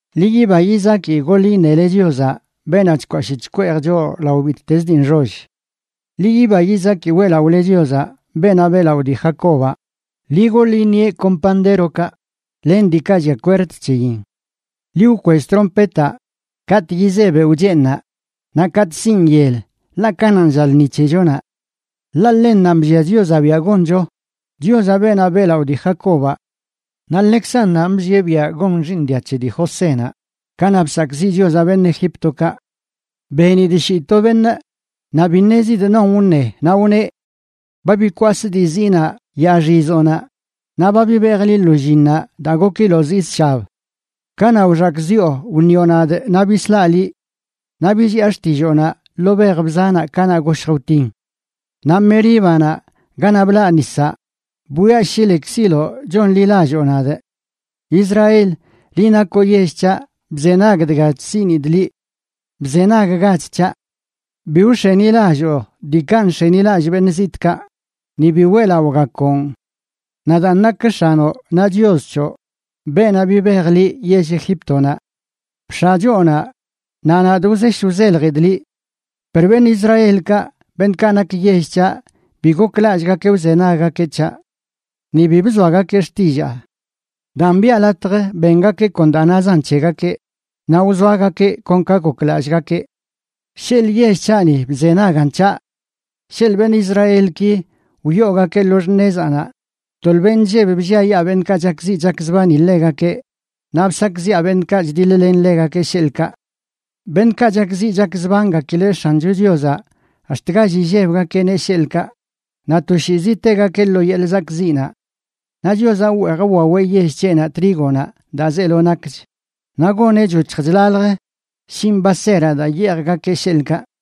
¡Ḻi yiba yizaki goḻ iṉele Chiozaꞌ, beenaꞌ chkwashꞌ chkweej choꞌ lao bittez dii nxoll! Ḻi yiba yizaki weꞌlaꞌole Chiozaꞌ, beenaꞌ beꞌlaꞌo dii Jacobaꞌ. Ḻi goḻ iṉieꞌ kon pandérokaꞌ len diikaꞌ llia kwerd c̱heyin. Ḻi wkwell trompetaꞌ katꞌ yizee beoꞌ cheeṉnaꞌ, Naꞌ katꞌ sinꞌ yel, ḻaꞌ kananꞌ lla lṉi c̱hechonaꞌ. Ḻaꞌ ḻennanꞌ bllia Chiozaꞌ biaꞌ goncho, Chiozaꞌ beenaꞌ beꞌlaꞌo dii Jacobaꞌ. Naꞌ ḻekzannanꞌ bllieꞌ biaꞌ gon xiiṉ dia c̱he dii Josénaꞌ kanaꞌ bsakꞌziꞌ Chiozaꞌ beṉꞌ Egíptokaꞌ. Benidꞌ shii to beṉꞌ, naꞌ bi ṉezidꞌ non wṉe, naꞌ wneꞌ: “Ba bikwasꞌ dii ziinaꞌ yaaxizoꞌnaꞌ, naꞌ ba bibejꞌ liꞌ lo llinnaꞌ daa gokiloꞌ zii zshab. Kanaꞌ wxakꞌziꞌo, wṉioꞌ nadꞌ naꞌ bislaꞌ liꞌ; naꞌ billiꞌa xtilloonaꞌ ḻoo bej bzanaꞌ kanaꞌ goshj wtin. Naꞌ Meríbanaꞌ, ganaꞌ blaꞌ nisaꞌ, bwiaꞌ shi lekziloꞌ chonḻilalloo nadꞌ. Israel, liꞌ nakoꞌ yell c̱haꞌ, bzenag dga chsiꞌnidꞌ liꞌ. Bzenaggach c̱haꞌ. Bi wx̱enilalloo diikaꞌ nx̱enilallꞌ beṉꞌ zitꞌkaꞌ ni bi weꞌlaꞌogakoꞌn. Nadaan nakꞌ X̱anoꞌ, naꞌ Chios c̱hoꞌ, beenaꞌ bibej liꞌ yell Egíptonaꞌ. Bx̱aꞌ choonaꞌ, naꞌ nadꞌ wzesh wzeljidꞌ liꞌ. “Per beṉꞌ Israelkaꞌ, beṉꞌkaꞌ nak yell c̱haꞌ, bi goklallꞌgakeꞌ wzenaggakeꞌ c̱haꞌ; ¡ni bi bzoagakeꞌ xtillaa! Daan, biꞌa latj bengakeꞌ kon daa nazan c̱hegakeꞌ, naꞌ wzoagakeꞌ kon ka goklallꞌgakeꞌ. ¡Sheḻꞌ yell c̱haꞌni bzenagan c̱haꞌ! ¡Sheḻꞌ beṉꞌ Israelki wyoogakeꞌ lo x̱nezaꞌnaꞌ, tolbeꞌ nlleb blliayaa beṉꞌkaꞌ chakziꞌ chakzbani ḻegakeꞌ naꞌ bsakꞌziꞌa beṉꞌkaꞌ chdiḻ-len ḻegakeꞌ, sheḻꞌkaꞌ!” Beṉꞌkaꞌ chakziꞌ chakzbangakileꞌ X̱ancho Chiozaꞌ, ax̱t gall illebgakeꞌneꞌ, sheḻꞌkaꞌ, naꞌ toshiizi tegakeꞌ lo yeḻꞌ zakꞌziꞌnaꞌ. Naꞌ Chiozaꞌ wweej wwaweꞌ yell c̱heꞌnaꞌ trígonaꞌ daa zeelo nakch, naꞌ goneꞌ choc̱hj chlalj shinꞌ baseraꞌ daa yeejgakeꞌ, sheḻꞌkaꞌ.